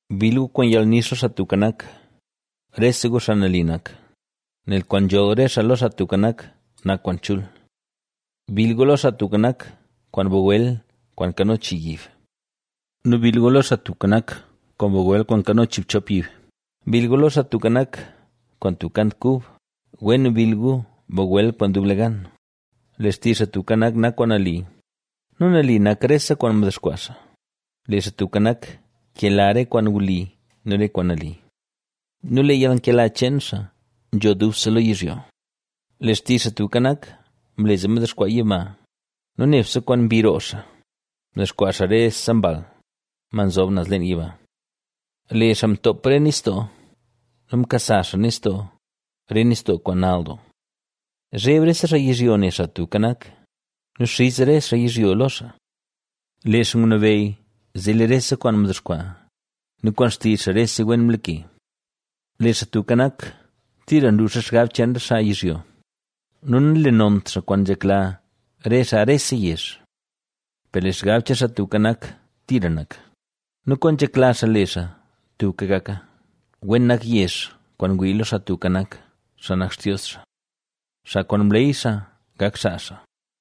Bill gu kwaan yalnix lo Xaa Tubka Nak, rese gu xaa nali nak, nel kwaan nzholl re xaa lo Xaa Tubka Nak, nak kwaan chul. Bill gu lo Xaa Tubka Nak kwaan bagwel kwaan nkano chii yib nu bill gu lo Xaa Tubka Nak kwaan bagwel kwaan nkano chiibchop yib. Bill lo Xaa Tubka Nak, kwaan tub kant kub, wen bill gu bagwel kwaan dublegan. Lee xtizh Xaa Tubka Nak nak kwaan nali nu nali nak rese kwaan mdexkwaa xaa. Lee Xaa Tubka Nak nkela re kwaan wli nu re kwaan nali ¡Nu lee yalnkela cheen xaa nzho dubse lo yizhyo! Lee xtizh Xaa Tubka Nak mle zee mdexkwaa yiba nu nebse kwaan mbi roo xaa, mdexkwaa xaa rese mbal, ma nzob naz leen yiba. Lee xaa ntoop re nistoo nu nkasa xaa nistoo, re nistoo kwaan nall doo. Zheb rese xaa yizhyo ne Xaa Tubka Nak nu xiz rese xaa yizhyo lo xaa. Lee xaa ngunabeyy zee lee rese kwaan mdexkwaa nu kwaan xtizh xaa rese wen mlake. Lee Xaa Tubka Nak, tira nluux re xgab cheen re xaa yizhyo, nu nanlenont xaa kwaan nzhekla re xaa rese yezh. Per lee xgab cheen Xaa Tubka Nak tira nak nu kwaan nzhekla xaa le xaa tubka gaka. Wen nak yezh kwaan ngwii lo Xaa Tubka Nak, xaa nak Xtios xaa, xaa kwaan mleey xaa gak xaa xaa.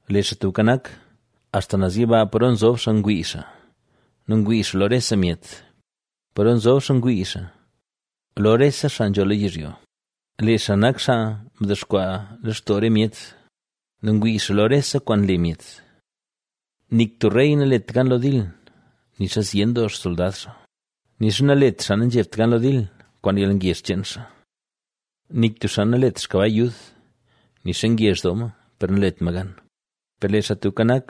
Lee Xaa Tubka Nak, axta naz yiba paro nzob xaa ngwii xaa nu ngwii xaa lo rese myet; paro nzob xaa ngwii xaa, lo rese xaa nzho lo yizhyo. Lee xaa nak xaa mdexkwaa lextoo re myet nu ngwii xaa lo rese kwaan nle myet. Nik tub rey nalet gan lo dil, nixa zyen doo xsoldad xaa, nixa nalet xaa nanzhebt gan lo dil, kwaan yalngezh cheen xaa. Nik tub xaa nanlet xkabay yud, nixa ngezh doo ma, per nalet ma gan. Per lee Xaa Tubka Nak,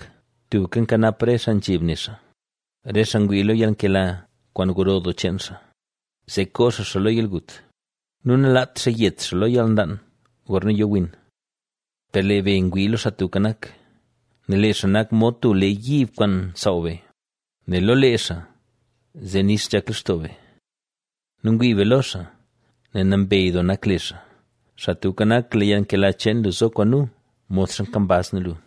tubka nkanap re xaa nzheb ne xaa, re xaa ngwii lo yalnkela kwaan gro doo cheen xaa, zee koo xaa xaa lo yalgut nu nalaat xaa yet xaa lo yalnlaan gorna yo win. Per lee be ngwii lo Xaa Tubka Nak, nel lee xaa nak mod tub lee yiib kwaan nsaaw be; nel lo lee xaa, zee nix nzhak lextoo be nu ngwii be lo xaa, nel nambey doo nak le xaa. Xaa Tubka Nak, lee yalnkela cheen lu zo kwaan nu, modxa kambaz nu lu.